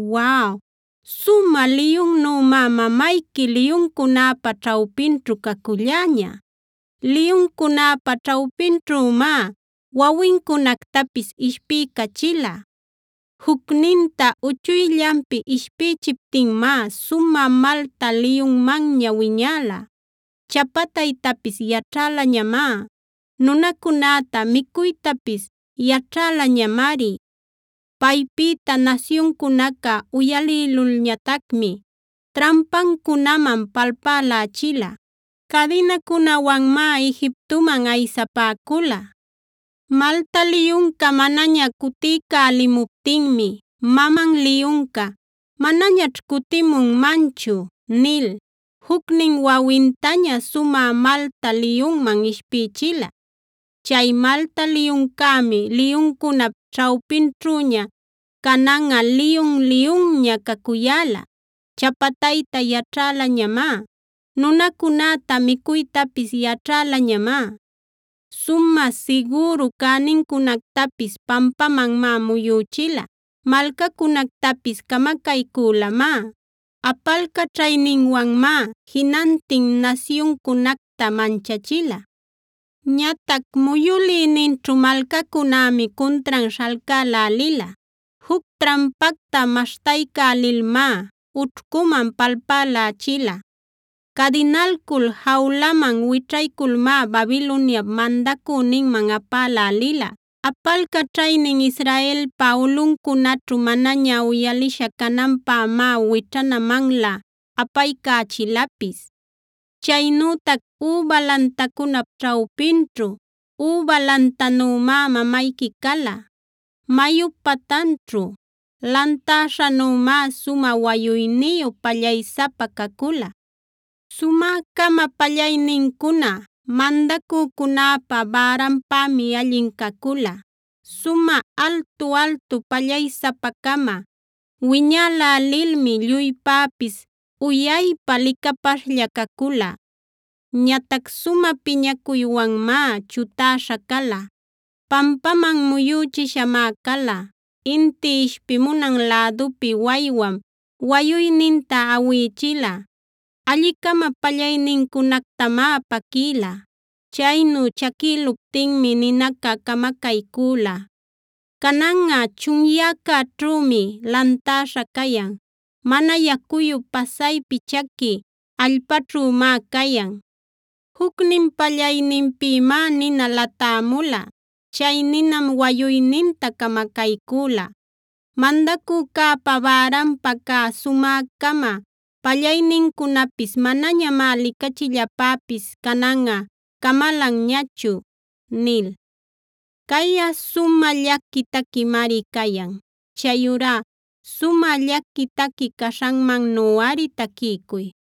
“Waw, sumä liyunnümá mamayqui liyuncunäpa ćhawpinćhu caculläña. Liyuncunäpa ćhawpinćhümá wawincunactapis ishpiycachila. Jucninta uchuyllanpi ishpïchiptinmá sumä malta liyunmanña wiñäla. Chapataytapis yaćhälañamá; nunacunäta micuytapis yaćhälañamari. Paypïta nasyuncunaca uyalïlulñatacmi trampancunaman palpälächila. Cadinacunawanmáa Egiptoman aysapäcula. “Malta liyunca manaña cuticälimuptinmi maman liyunca: ‘Manañaćh cutimunmanchu’ nil, jucnin wawintaña sumä malta liyunman ishpïchila. Chay malta liyuncämi liyuncunap ćhawpinćhüña cananꞌa liyun-liyunña cacuyäla. Chapatayta yaćhälañamá; nunacunäta micuytapis yaćhälañamá. Sumä sigüru cänincunactapis pampamanmá muyüchila; malcacunactapis camacaycülamá. Apalcaćhayninwanmá jinantin nasyuncunacta manchachila. Ñatac muyülïninćhu malcacunämi cuntran śhalcälälila. Juc trampacta maśhtaycälilmá ućhcuman palpälächila. Cadinalcul jawlaman wićhayculmá Babiloniap mandacüninman apälälila. Apalcaćhaynin Israelpa ulꞌuncunaćhu manaña uyalisha cananpämá wićhanamanlä apaycächilapis. “Chaynütac üba lantacunap ćhawpinćhu üba lantanümá mamayqui cala. Mayup patanćhu lantäśhanümá sumä wayuyniyu, pallaysapa cacula. Sumä-cama pallaynincuna mandacücunäpä bäranpämi allin cacula; sumä altu-altu pallaysapa-cama wiñälälilmi lluypäpis uyaypa licapaśhlla cacula. Ñatac sumä piñacuywanmá chutäśha cala; pampaman muyüchishamá cala. Inti ishpimunan lädupi waywam wayuyninta awïchila; alli-cama pallaynincunactamá paquïla. Chaynu chaquïluptinmi ninaca camacaycüla. Cananꞌa chunyäcäćhümi lantäśha cayan; mana yacuyu pasaypi chaqui allpaćhümá cayan. Jucnin pallayninpïmá nina latämula; chay ninam wayuyninta camacaycüla. Mandacücäpa bäranpa cä sumä-cama pallaynincunapis manañamá licachillapäpis cananꞌa camalanñachu” nil. Cayꞌa sumä llaqui taquimari cayan. Chayurá sumä llaqui taqui caśhanmannuꞌari taquiycuy.